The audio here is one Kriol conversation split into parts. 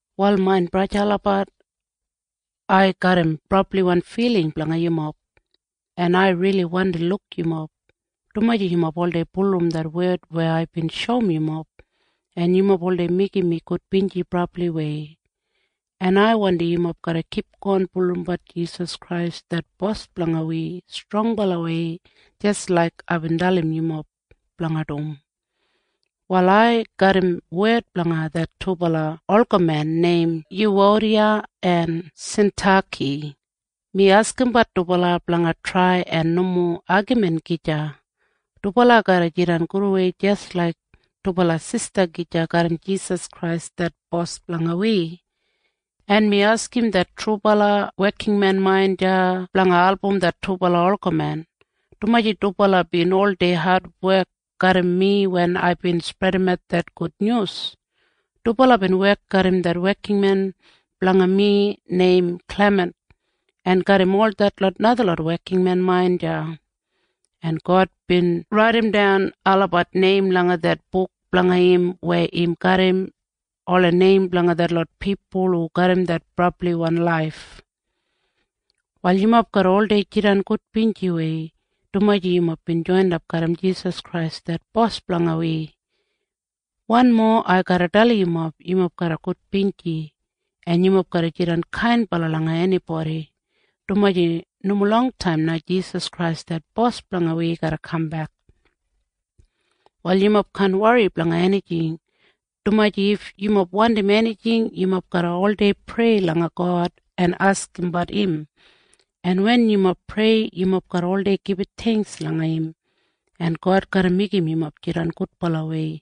Wal main braja en sista olabat, ai garram brabliwan filing blanga yumob, en ai rili wandi luk yumob, dumaji yumob oldei bulurrum det wed weya aibin shoum yumob, en yumob oldei meigim mi gudbinji brabliwei. En ai wandim yumob garra kipgon bulurrumbat Jisas Krais det Bos blanga wi strongbalawei jis laik aibin dalim yumob blanga dum. Wal ai garram wed blanga det dubala olgamen neim Yuwodiya en Sintaki. Mi askimbat dubala blanga trai en nomo agamin gija. Dubala garra jidan gudwei jis laik dubala sista gija garram Jisas Krais det Bos blanga wi. En mi askim det trubala wekinmen main deya blanga album det dubala olgamen, dumaji dubala bin oldei adwek garram mi wen aibin spredimat det gudnyus. Dubala bin wek garram det wekinmen blanga mi neim Klimint en garram ol detlot najalot wekinmen main deya, en God bin raidimdan olabat neim langa det buk blanga im weya im garram ola neim blanga detlot pipul hu garram det brabliwan laif. Wal yumob garra oldei jidan gudbinjiwei, dumaji yumob bin joinap garram Jisas Krais det Bos blanga wi. Wanmo ai garra dalim yumob. Yumob garra gudbinji, en yumob garra jidan kainbala langa enibodi, dumaji nomo longtaim na Jisas Krais det Bos blanga wi garra kambek. Wal yumob kaan wori blanga enijing, dumaji if yumob wandim enijing, yumob garra oldei prei langa God en askimbat im, en wen yumob prei, yumob garra oldei gibit theingks langa im, en God garra meigim yumob jidan gudbalawei.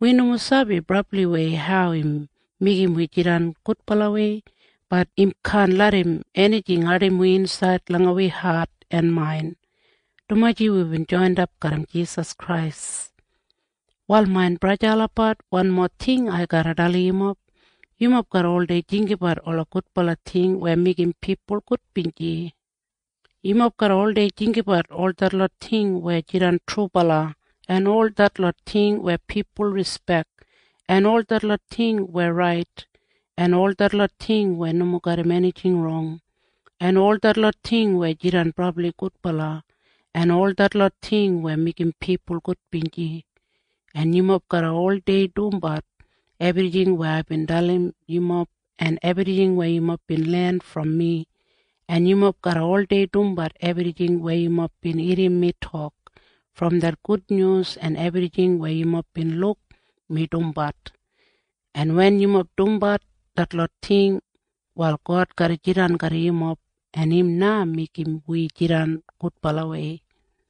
Wi nomo sabi brabliwei hau im meigim wi jidan gudbalawei. Bat im kaan larram enijing ardim wi insaid langa wi hat en main, dumaji wibin joinap garram Jisas Krais. Wal main braja en sista olabat, wanmo ting ai garra dalim yumob. Yumob garra oldei jinggabat ola gudbala ting weya meigim pipul gudbinji. Yumob garra oldei jinggabat ol detlot ting weya jidan trubala, en ol detlot ting weya pipul rispek, en ol detlot ting weya rait, en ol detlot ting weya nomo garram enijing rong, en ol detlot ting weya jidan brabli gudbala, en ol detlot ting weya meigim pipul gudbinji. En yumob garra oldei dumbat ebrijing weya aibin dalim yumob en ebrijing weya yumob bin len brom mi, en yumob garra oldei dumbat ebrijing weya yumob bin irrim mi tok brom det gudnyus en ebrijing weya yumob bin luk mi dumbat. En wen yumob dumbat detlot ting, wal God garra jidan garram yumob, en im na meigim wi jidan gudbalawei.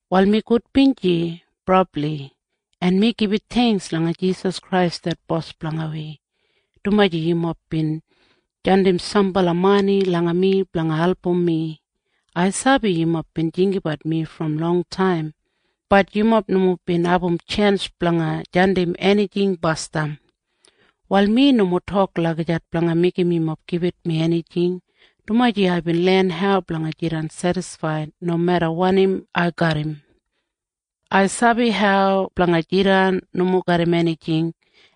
Wal mi gudbinji brabli, en mi gibit theingks langa Jisas Krais det Bos blanga wi, dumaji yumob bin jandim sambala mani langa mi blanga album mi. Ai sabi yumob bin jinggabat mi brom longtaim. Bat yumob nomo bin abum tjens blanga jandim enijing basdam. Wal mi nomo tok lagijat blanga meigim yumob gibit mi enijing, dumaji aibin len hau blanga jidan sedisfaid nomeda wanim ai garram. Ai sabi hau blanga jidan nomo garram enijing,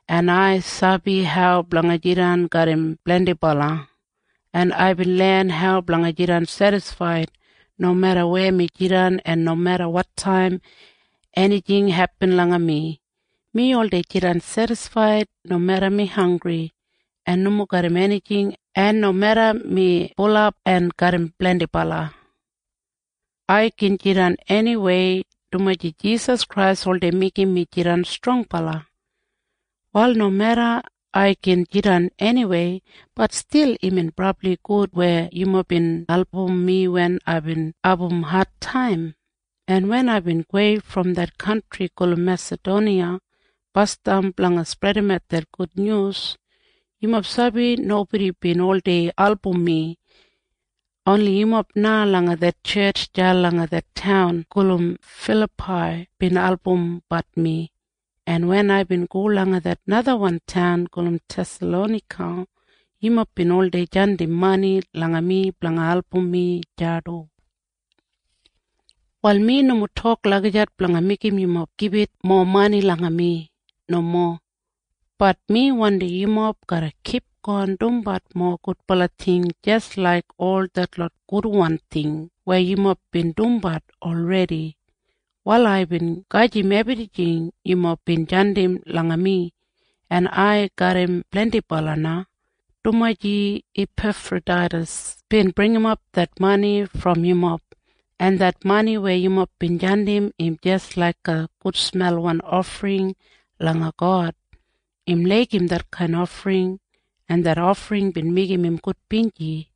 en ai sabi hau blanga jidan garram blendibala, en aibin len hau blanga jidan sedisfaid nomeda weya mi jidan en nomeda wotaim enijing hepin langa mi. Mi oldei jidan sedisfaid nomeda mi hanggri en nomo garram enijing en nomeda mi bulap en garram blendibala. Ai gin jidan eniwei, dumaji Jisas Krais oldei meigim mi jidan strongbala. Wal nomeda ai gin jidan eniwei, bat stil imbin brabli gud weya yumob bin album mi wen aibin abum adtaim, en wen aibin gowei brom det kantri gulum Mesadoniya basdam blanga spredimat det gudnyus, yumob sabi nobodi bin oldei album mi. Oni yumob na langa det tjetj deya langa det taun gulum Filapai bin albumbat mi. En wen aibin go langa det najawan taun gulum Thesalonaika, yumob bin oldei jandim mani langa mi blanga album mi deya du. Wal mi nomo tok lagijat blanga meigim yumob gibit mowa mani langa mi. Nomo. Bat mi wandim yumob garra kipgon dumbat mowa gudbala ting jis laik ol detlot gudwan ting weya yumob bin dumbat olredi. Wal aibin gedim ebrijing yumob bin jandim langa mi, en ai garram blendibala na, dumaji Ipefrodaitas bin bringimap det mani brom yumob, en det mani weya yumob bin jandim, im jis laiga gudsmelwan ofring langa God. Im laigim detkain ofring, en det ofring bin meigim im gudbinji.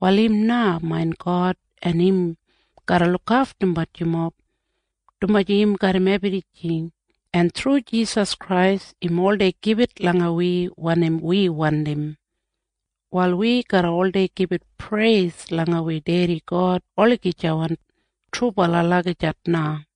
Wal im na main God, en im garra lukaftumbat yumob, dumaji im garram ebrijing, en thru Jisas Krais im oldei gibit langa wi wanim wi wandim. Wal wi garra oldei gibit preis langa wi Dedi God olagijawan. Trubala. Lagijat na.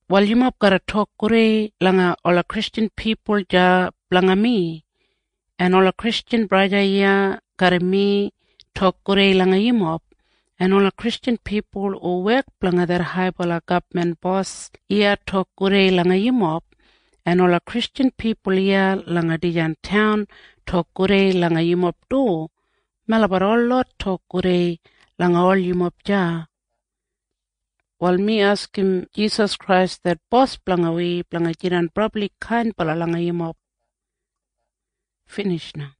Wal yumob garra tok gudei langa ola Kristjan pipul deya blanga mi. En ola Kristjan braja en sista iya garram mi tok gudei langa yumob, en ola Kristjan pipul hu wek blanga det haibala gabman bos iya tok gudei langa yumob, en ola Kristjan pipul iya langa dijan taun tok gudei langa yumob du. Melabat holot tok gudei langa ol yumob deya. Wal mi askim Jisas Krais det Bos blanga wi blanga jidan brabli kainbala langa yumob. Binij na.